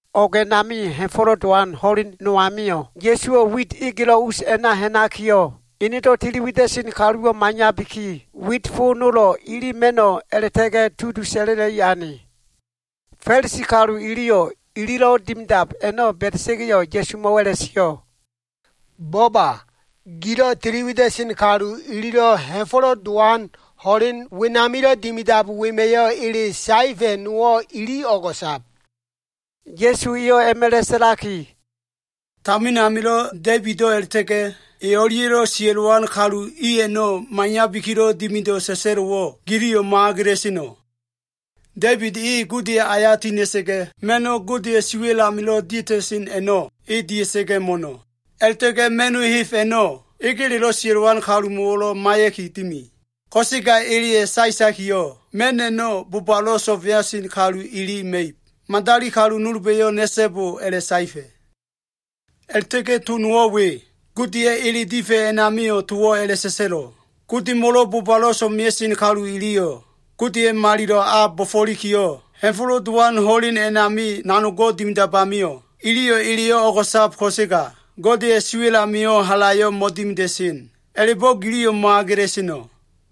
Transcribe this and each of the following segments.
O꞉g a꞉nami, Ha꞉fo꞉lo꞉ Dowan ho꞉len no amio꞉, Ya꞉suwo꞉ wit egelo꞉ us a꞉na ha꞉nakiyo꞉, enedo꞉ tili wida꞉sen kaluwo꞉ maiyabiki, wit fo nolo꞉ ili ma꞉no꞉ a꞉la꞉ta꞉ga꞉ tudu sa꞉la꞉la꞉i ane. Fa꞉lisi kalu iliyo꞉, ililo꞉ dimidab a꞉no꞉ ba꞉da꞉sa꞉ga꞉yo꞉, Ya꞉sumo꞉wo꞉ a꞉la꞉sio꞉, “Bo꞉ba! Gilo꞉ tiliwida꞉sen kalu ililo꞉ Ha꞉fo꞉lo꞉ Dowan ho꞉len wenamilo꞉ dimidab wema꞉yo꞉ ele saefa꞉ nowo꞉ ili o꞉go꞉sab.” Ya꞉su eyo꞉ a꞉ma꞉la꞉ sa꞉laki, “Tamin amilo꞉ Da꞉ibido꞉ a꞉la꞉ta꞉ga꞉ e o꞉lia꞉lo꞉ sia꞉lowan kalu i a꞉no꞉ maiyabikilo꞉ dimido꞉ sa꞉sa꞉lo꞉wo꞉, giliyo꞉ mo꞉agela꞉seno꞉? Da꞉ibid e Godeya꞉ aya tiha꞉na꞉sa꞉ga꞉, ma꞉no꞉ Godeya꞉ siwa꞉l amilo꞉ dia꞉ta꞉sen a꞉no꞉, e dia꞉sa꞉ga꞉ mo꞉no꞉. A꞉la꞉ta꞉ga꞉ ma꞉no꞉ heb a꞉no꞉ egeledo꞉ sia꞉lowan kalumo꞉wo꞉lo꞉ maiya꞉ki dimi. Ko꞉sega eleya꞉ saetakiyo꞉, ma꞉n a꞉no꞉ Godemo꞉lo꞉ bobalo꞉ so꞉mea꞉sen kalu ili ma꞉ib. Madali kalu nolba꞉yo꞉ na꞉so꞉bo a꞉la꞉saefa꞉. A꞉la꞉ta꞉ga꞉ to nowo꞉ we. Godeya꞉ ele difa꞉ a꞉namio꞉, towo꞉ a꞉la꞉sa꞉sa꞉lo꞉. Godemo꞉lo꞉ bobalo꞉ so꞉mea꞉sen kalu iliyo꞉ Godeya꞉ malilo꞉ a bo꞉fo꞉likiyo꞉, Ha꞉fo꞉lo꞉ Dowan ho꞉len a꞉nami nanogo꞉ dimidab amio꞉, iliyo꞉ eleyo꞉ o꞉go꞉sab ko꞉sega, Godeya꞉ siwa꞉l amio꞉ halayo꞉ mo꞉dimida꞉sen. A꞉la꞉bo꞉ giliyo꞉ mo꞉agela꞉seno꞉?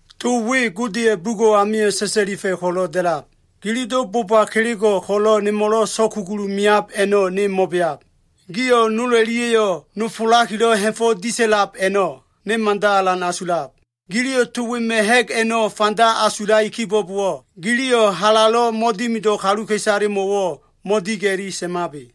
To we Godeya꞉ bugo꞉ amio꞉ sa꞉sa꞉lifa꞉ ko꞉lo꞉ da꞉lab, ‘Gililo꞉ boba kelego꞉ ko꞉lo꞉ nemo꞉lo꞉ so꞉kugulu meab a꞉no꞉ ne mo꞉beab. Gio꞉ nol o꞉lia꞉yo꞉ nofolakilo꞉ ha꞉fo꞉ disa꞉lab a꞉no꞉ ne mada alan asulab.’ Giliyo꞉ to wema꞉ ha꞉g a꞉no꞉ fanda asulai kibo꞉bowo꞉, giliyo꞉ halalo꞉ mo꞉dimido꞉ kaluka꞉isalemo꞉wo꞉ mo꞉diga꞉li sa꞉mabe.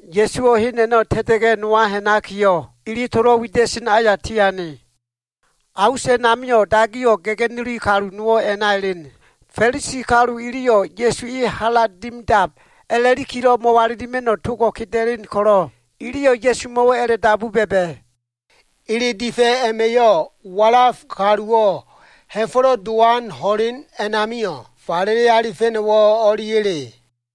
Ya꞉suwo꞉ hen a꞉no꞉ ta꞉ta꞉ga꞉ nowa ha꞉nakiyo꞉, ili tolo꞉ wida꞉sen aya tiane. A us a꞉namio꞉ dagiyo꞉ ga꞉ga꞉nuli kalu nowo꞉ a꞉na elen. Fa꞉lisi kalu iliyo꞉ Ya꞉su e hala dimidab a꞉la꞉likilo꞉ mo꞉walilima꞉no꞉ togo꞉ keda꞉len ko꞉lo꞉, iliyo꞉ Ya꞉sumo꞉wo꞉ a꞉la꞉dabu ba꞉ba꞉, “Ele difa꞉ a꞉ma꞉yo꞉, walaf kaluwo꞉ Ha꞉fo꞉lo꞉ Dowan ho꞉len a꞉namio꞉ falele alifa꞉no꞉wo꞉ o꞉liya꞉le?”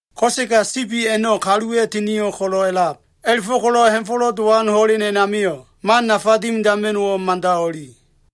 Ko꞉sega sibi a꞉no꞉ kaluwa꞉ tinio꞉ ko꞉lo꞉ a꞉lab. A꞉la꞉fo꞉ko꞉lo꞉ ha꞉fo꞉lo꞉ dowan ho꞉len a꞉namio꞉ man nafa dimidama꞉no꞉wo꞉ mada o꞉li.”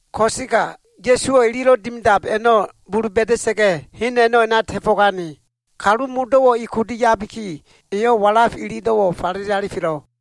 Ko꞉sega Ya꞉suwo꞉ ililo꞉ dimidab a꞉no꞉ bulu ba꞉da꞉sa꞉ga꞉, hen a꞉no꞉ a꞉na ta꞉fo꞉gane. Kalu modo꞉wo꞉ e kudu yabiki, eyo꞉ walaf ililo꞉wo꞉ falele alifelo꞉.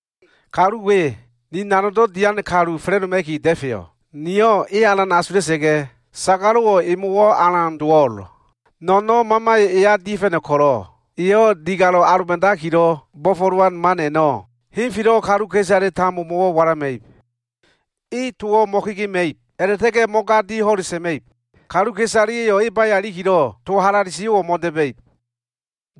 “Kalu we, ni nanogdo꞉ dian kalu fa꞉la꞉doma꞉ki da꞉feyo꞉. Niyo꞉ e alan asula꞉sa꞉ga꞉, sagalo꞉wo꞉ emo꞉wo꞉ alan dowo꞉l. No꞉no꞉n mamayo꞉ eya dia꞉fa꞉no꞉ ko꞉lo꞉, eyo꞉ digale aloba꞉dakilo꞉ bo꞉fo꞉lowan man a꞉no꞉ henfelo꞉ kaluka꞉isale tambomo꞉wo꞉ walama꞉ib. E towo꞉ mo꞉kegema꞉ib a꞉la꞉ta꞉ga꞉ mo꞉gadi ho꞉le sa꞉ma꞉ib. Kaluka꞉isaleya꞉yo꞉ e baya ilikilo꞉ to halale sio꞉wo꞉ mo꞉da꞉ba꞉ib.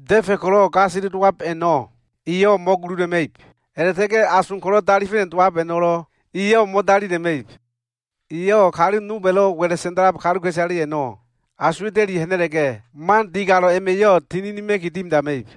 Da꞉fa꞉ ko꞉lo꞉ gasele dowab a꞉no꞉ eyo꞉ mo꞉gulula꞉ma꞉ib. A꞉la꞉ta꞉ga꞉ ason ko꞉lo꞉ dalifa꞉no꞉ dowab a꞉no꞉lo꞉ eyo꞉ mo꞉dalila꞉ma꞉ib. Eyo꞉ kaluka꞉isale nolba꞉lo꞉ wa꞉la꞉ sa꞉nda꞉lab i a꞉no꞉ asuwa꞉ta꞉li ha꞉na꞉la꞉ga꞉, man digalo꞉ a꞉ma꞉yo꞉ tininima꞉ki dimidama꞉ib.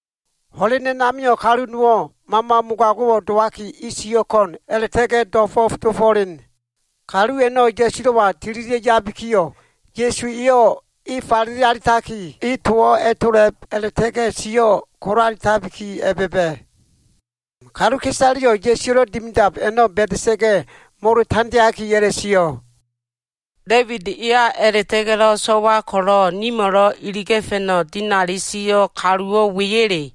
Ho꞉len a꞉namio꞉ kalu nowo꞉ mama mogago꞉ dowaki, e sio꞉ ko꞉n a꞉la꞉ta꞉ga꞉ do꞉fo꞉f dofo꞉len. Kalu a꞉no꞉ Ya꞉sulo꞉wa tililia꞉ yabikiyo꞉, Ya꞉su eyo꞉ e falele alitaki, e towo꞉ a꞉tola꞉b, a꞉la꞉ta꞉ga꞉ sio꞉ kolaetabiki a꞉ba꞉ba꞉. Kaluka꞉isaleyo꞉ Ya꞉suwa꞉lo꞉ dimidab a꞉no꞉ ba꞉da꞉sa꞉ga꞉, molo tandeaki a꞉la꞉sio꞉, “Da꞉ibid eya a꞉la꞉ta꞉ga꞉lo꞉ so꞉wa ko꞉lo꞉ nimo꞉lo꞉ iliga꞉fa꞉no꞉ dinali sio꞉ kaluwo꞉ weya꞉le?”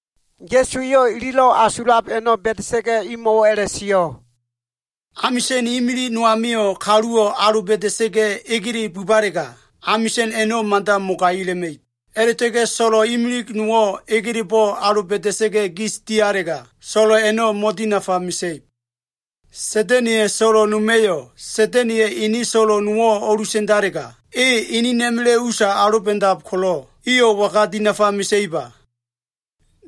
Ya꞉su eyo꞉ ililo꞉ asulab a꞉no꞉ ba꞉da꞉sa꞉ga꞉, imo꞉wo꞉ a꞉la꞉sio꞉, “Amisa꞉n imilig no amio꞉ kaluwo꞉ aloba꞉da꞉sa꞉ga꞉ egele bubalega, amisa꞉n a꞉no꞉ mada mogaila꞉ma꞉ib. A꞉la꞉ta꞉ga꞉ so꞉lo꞉ imilig nowo꞉ egelebo꞉ aloba꞉da꞉sa꞉ga꞉ gis dialega, so꞉lo꞉ a꞉no꞉ mo꞉dinafa mesa꞉ib. Sa꞉da꞉na꞉ya꞉ so꞉lo꞉ noma꞉yo꞉ Sa꞉da꞉na꞉ya꞉ ene so꞉lo꞉ nowo꞉ o꞉lusa꞉ndalega, e inina꞉ma꞉la꞉ usa aloba꞉dab ko꞉lo꞉, iyo꞉ waga dinafa mesa꞉iba?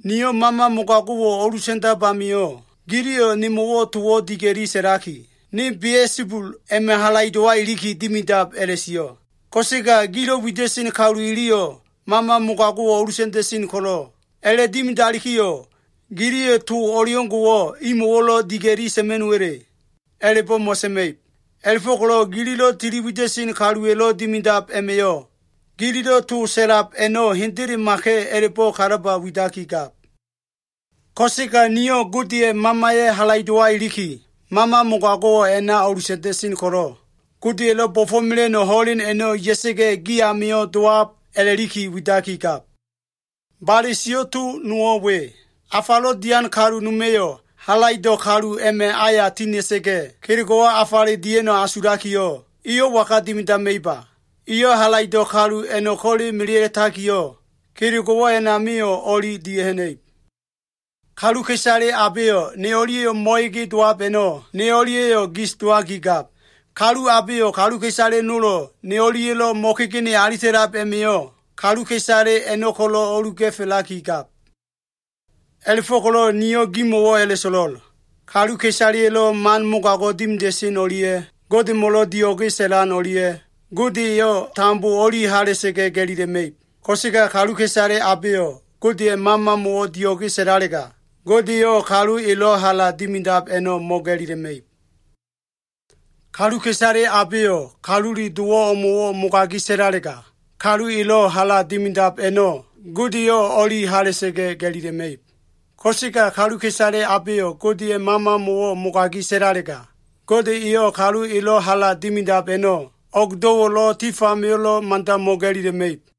Niyo꞉ mama mogago꞉wo꞉ o꞉lusa꞉ndab amio꞉, giliyo꞉ towo꞉ nemo꞉ diga꞉li sa꞉laki, ‘ne Bia꞉sabul a꞉ma꞉ halaido꞉wa iliki dimidab’ a꞉la꞉sio꞉. Ko꞉sega gilo꞉ wida꞉sen kalu iliyo꞉ mama mogago꞉wo꞉ o꞉lusa꞉nda꞉sen ko꞉lo꞉, a꞉la꞉dimidalikiyo꞉ giliyo꞉ to o꞉leo꞉ngo꞉wo꞉ imo꞉wo꞉lo꞉ diga꞉li sa꞉ma꞉no꞉wa꞉le? A꞉la꞉bo꞉ mo꞉sa꞉ma꞉ib. A꞉la꞉fo꞉ko꞉lo꞉ gililo꞉ tili wida꞉sen kaluwa꞉lo꞉ dimidab a꞉ma꞉yo꞉, gililo꞉ to sa꞉lab a꞉no꞉ hendelemaka꞉ a꞉labo꞉ kalaba widakigab. Ko꞉sega niyo꞉ Godeya꞉ Mamaya꞉ halaido꞉wa iliki, mama mogago꞉wo꞉ a꞉na o꞉lusa꞉nda꞉sen ko꞉lo꞉, Godeya꞉lo꞉ bo꞉fo꞉mela꞉no꞉ ho꞉len a꞉no꞉ ya꞉sa꞉ga꞉ gi amio꞉ dowab a꞉la꞉liki widakigab. “Bale sio꞉ to nowo꞉ we. Afalo꞉ dian kalu noma꞉yo꞉ halaido꞉ kalu a꞉ma꞉ aya tina꞉sa꞉ga꞉ kelego꞉wo꞉ afale dia꞉no꞉ asulakiyo꞉, eyo꞉ waga dimidama꞉iba? Eyo꞉ halaido꞉ kalu a꞉no꞉ ko꞉le melea꞉takiyo꞉, kelego꞉wo꞉ a꞉namio꞉ o꞉li dia꞉ha꞉na꞉ib. “Kaluka꞉isale abeyo꞉ ne o꞉lia꞉yo꞉ mo꞉ege dowab a꞉no꞉, ne o꞉lia꞉yo꞉ gis dowakigab. Kalu abeyo꞉ kaluka꞉isale nolo꞉ ne o꞉lia꞉lo꞉ mo꞉kegene alita꞉lab a꞉ma꞉yo꞉, kaluka꞉isale a꞉no꞉ ko꞉lo꞉ o꞉luga꞉felakigab. “A꞉la꞉fo꞉ko꞉lo꞉ niyo꞉ gimo꞉wo꞉ a꞉la꞉so꞉lo꞉l. Kaluka꞉isaleya꞉lo꞉ man mogago꞉ dimida꞉sen o꞉lia꞉ Godemo꞉lo꞉ dio꞉ge sa꞉lan o꞉lia꞉, Gode eyo꞉ tambo o꞉li hala꞉sa꞉ga꞉ ga꞉lila꞉ma꞉ib. Ko꞉sega kaluka꞉isale abeyo꞉ Godeya꞉ Mamamo꞉wo꞉ dio꞉ge sa꞉lalega, Gode eyo꞉ kalu elo꞉ hala dimidab a꞉no꞉ mo꞉ga꞉lila꞉ma꞉ib. Kaluka꞉isale abeyo꞉ Kalule Dowo꞉ o꞉mo꞉wo꞉ mogagi sa꞉lalega, kalu elo꞉ hala dimidab a꞉no꞉ Gode eyo꞉ o꞉li hala꞉sa꞉ga꞉ ga꞉lila꞉ma꞉ib. Ko꞉sega kaluka꞉isale abeyo꞉ Godeya꞉ Mamamo꞉wo꞉ mogagi sa꞉lalega, Gode eyo꞉ kalu elo꞉ hala dimidab a꞉no꞉ o꞉gdo꞉wo꞉lo꞉, tif amio꞉lo꞉ mada mo꞉ga꞉lila꞉ma꞉ib.”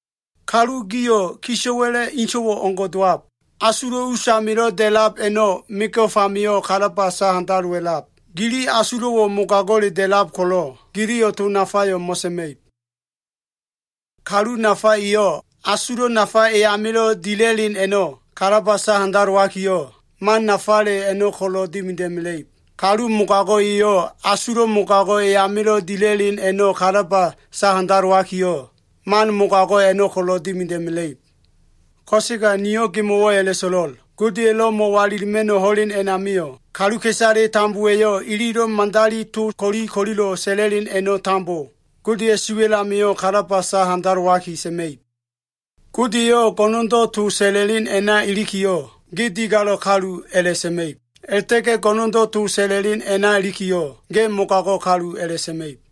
Kalu gio꞉ kisa꞉wa꞉la꞉ inso꞉ o꞉ngo꞉ dowab. Asulo꞉ usamilo꞉ da꞉lab a꞉no꞉ mego꞉f amio꞉ kalaba sahandalowa꞉lab. Gili asulo꞉wo꞉ mogago꞉le da꞉lab ko꞉lo꞉, giliyo꞉ to nafayo꞉ mo꞉sa꞉ma꞉ib. Kalu nafa eyo꞉, asulo꞉ nafa e amilo꞉ dila꞉len a꞉no꞉ kalaba sahandalowakiyo꞉, man nafale a꞉no꞉ ko꞉lo꞉ dimida꞉mela꞉ib. Kalu mogago꞉ eyo꞉, asulo꞉ mogago꞉ e amilo꞉ dila꞉len a꞉no꞉ kalaba sahandalowakiyo꞉, man mogago꞉ a꞉no꞉ ko꞉lo꞉ dimida꞉mela꞉ib. Ko꞉sega niyo꞉ gimo꞉wo꞉ a꞉la꞉so꞉lo꞉l. Godeya꞉lo꞉ mo꞉walilima꞉no꞉ ho꞉len a꞉namio꞉, kaluka꞉isale tambowa꞉yo꞉ ililo꞉ madali to ko꞉li ko꞉lilo꞉ sa꞉la꞉len a꞉no꞉ tambo Godeya꞉ siwa꞉l amio꞉ kalaba sa handalowaki sa꞉ma꞉ib. Gode eyo꞉ go꞉no꞉ndo꞉ to sa꞉la꞉len a꞉na ilikiyo꞉, ge digalo꞉ kalu a꞉la꞉sa꞉ma꞉ib. A꞉la꞉ta꞉ga꞉ go꞉no꞉ndo꞉ to sa꞉la꞉len a꞉na ilikiyo꞉, ge mogago꞉ kalu a꞉la꞉sa꞉ma꞉ib.”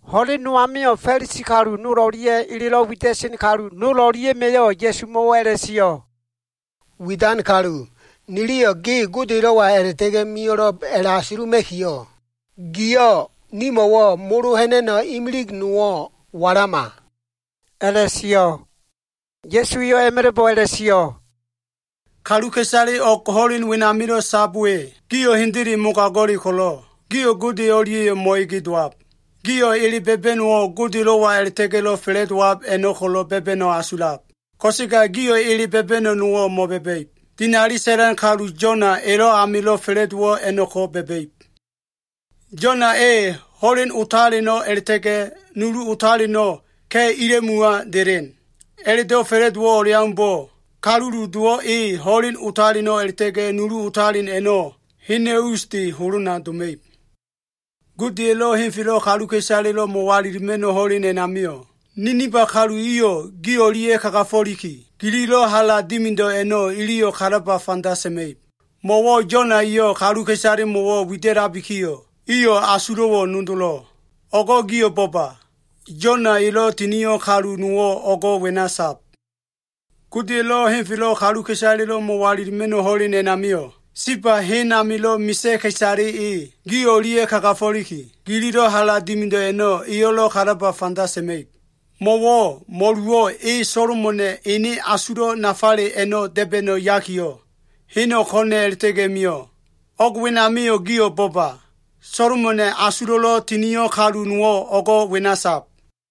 Ho꞉len no amio꞉ Fa꞉lisi kalu nol o꞉lia꞉ elelo꞉ wida꞉sen kalu nol o꞉lia꞉ma꞉yo꞉ Ya꞉sumo꞉wo꞉ a꞉la꞉sio꞉, “Widan kalu, niliyo꞉ ge Godelo꞉wa a꞉la꞉ta꞉ga꞉ mio꞉lo꞉b a꞉la꞉asuluma꞉kiyo꞉, giyo꞉ nimo꞉wo꞉ molo ha꞉na꞉no꞉ nowo꞉ walama,” a꞉la꞉sio꞉. Ya꞉su eyo꞉ a꞉ma꞉la꞉bo꞉ a꞉la꞉sio꞉, “Kaluka꞉isale o꞉g ho꞉len wenamilo꞉ sab we, gio꞉ hendele mogago꞉le ko꞉lo꞉, gio꞉ Gode o꞉lia꞉yo꞉ mo꞉ege dowab. Gio꞉ ele ba꞉ba꞉no꞉wo꞉ Godelo꞉wa a꞉la꞉ta꞉ga꞉lo꞉ fa꞉la꞉dowab a꞉no꞉ ko꞉lo꞉ ba꞉ba꞉no꞉ asulab. Ko꞉sega gio꞉ ele ba꞉ba꞉no꞉ nowo꞉ mo꞉ba꞉ba꞉ib. Dinali sa꞉lan kalu Yona elo꞉ amilo꞉ fa꞉la꞉dowo꞉ a꞉no꞉ko꞉ ba꞉ba꞉ib. Yona e ho꞉len otaleno꞉ a꞉la꞉ta꞉ga꞉ nulu otaleno꞉ ka꞉ ila꞉muwa delen. A꞉la꞉do꞉ fa꞉la꞉dowo꞉ o꞉leaumbo꞉ Kalule Dowo꞉ e ho꞉leno꞉ otalen a꞉la꞉ta꞉ga꞉ nulu otalen a꞉no꞉ hena꞉ usde holona doma꞉ib. Godeya꞉lo꞉ henfelo꞉ kaluka꞉isalelo꞉ mo꞉walilima꞉no꞉ ho꞉len a꞉namio꞉, Ninifa kalu iyo꞉ gi o꞉lia꞉ kagafo꞉liki, gililo꞉ hala dimido꞉ a꞉no꞉ iliyo꞉ kalaba fanda sa꞉ma꞉ib. Mo꞉wo꞉ Yona eyo꞉ kaluka꞉isalemo꞉wo꞉ wida꞉labikiyo꞉, iyo꞉ asulo꞉wo꞉ nodolo꞉. O꞉go꞉ gio꞉ bo꞉ba! Yona elo꞉ tinio꞉ kalu nowo꞉ o꞉go꞉ wena sab. Godeya꞉lo꞉ henfelo꞉ kaluka꞉isalelo꞉ mo꞉walilima꞉no꞉ ho꞉len a꞉namio꞉, Seba hen amilo꞉ misa꞉ ka꞉isale e, gi o꞉lia꞉ kagafo꞉liki, gililo꞉ hala dimido꞉ a꞉no꞉ eyo꞉lo꞉ kalaba fanda sa꞉ma꞉ib. Mo꞉wo꞉ mo꞉luwo꞉ e Solomona꞉ ene asulo꞉ nafale a꞉no꞉ da꞉ba꞉no꞉ yakiyo꞉, heno꞉ ko꞉na꞉ a꞉la꞉ta꞉ga꞉ mio꞉. O꞉g wenamio꞉ gio꞉ bo꞉ba! Solomona꞉ asulo꞉lo꞉ tinio꞉ kalu nowo꞉ o꞉go꞉ wena sab.”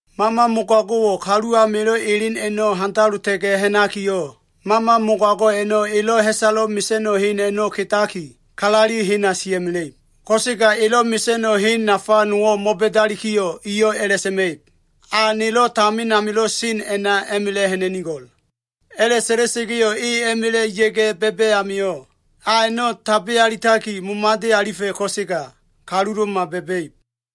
“Mama mogago꞉wo꞉ kalu amilo꞉ elen a꞉no꞉ handalota꞉ga꞉ ha꞉nakiyo꞉, mama mogago꞉ a꞉no꞉ elo꞉ ha꞉salo꞉ mesa꞉no꞉ hen a꞉no꞉ kedaki, kalaleli hena sia꞉mela꞉ib. Ko꞉sega elo꞉ mesa꞉no꞉ hen nafa nowo꞉ mo꞉ba꞉dalikiyo꞉, eyo꞉ a꞉la꞉sa꞉ma꞉ib, ‘A nelo꞉ tamin amilo꞉ sen a꞉na a꞉ma꞉la꞉ ha꞉na꞉nigo꞉l.’ A꞉la꞉sa꞉la꞉sa꞉ga꞉yo꞉, e a꞉ma꞉la꞉ ya꞉ga꞉ ba꞉ba꞉ amio꞉, a a꞉no꞉ tabe alitaki, momade alifa꞉ ko꞉sega kalulo꞉ma ba꞉ba꞉ib.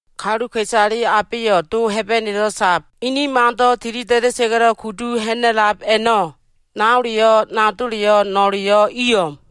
Kaluka꞉isale abeyo꞉ Do Hebenelo꞉ sab ene mando꞉ tilida꞉da꞉sa꞉ga꞉lo꞉ kudu ha꞉na꞉lab a꞉no꞉, naoleyo꞉, nadoleyo꞉, no꞉leyo꞉ i o꞉m.”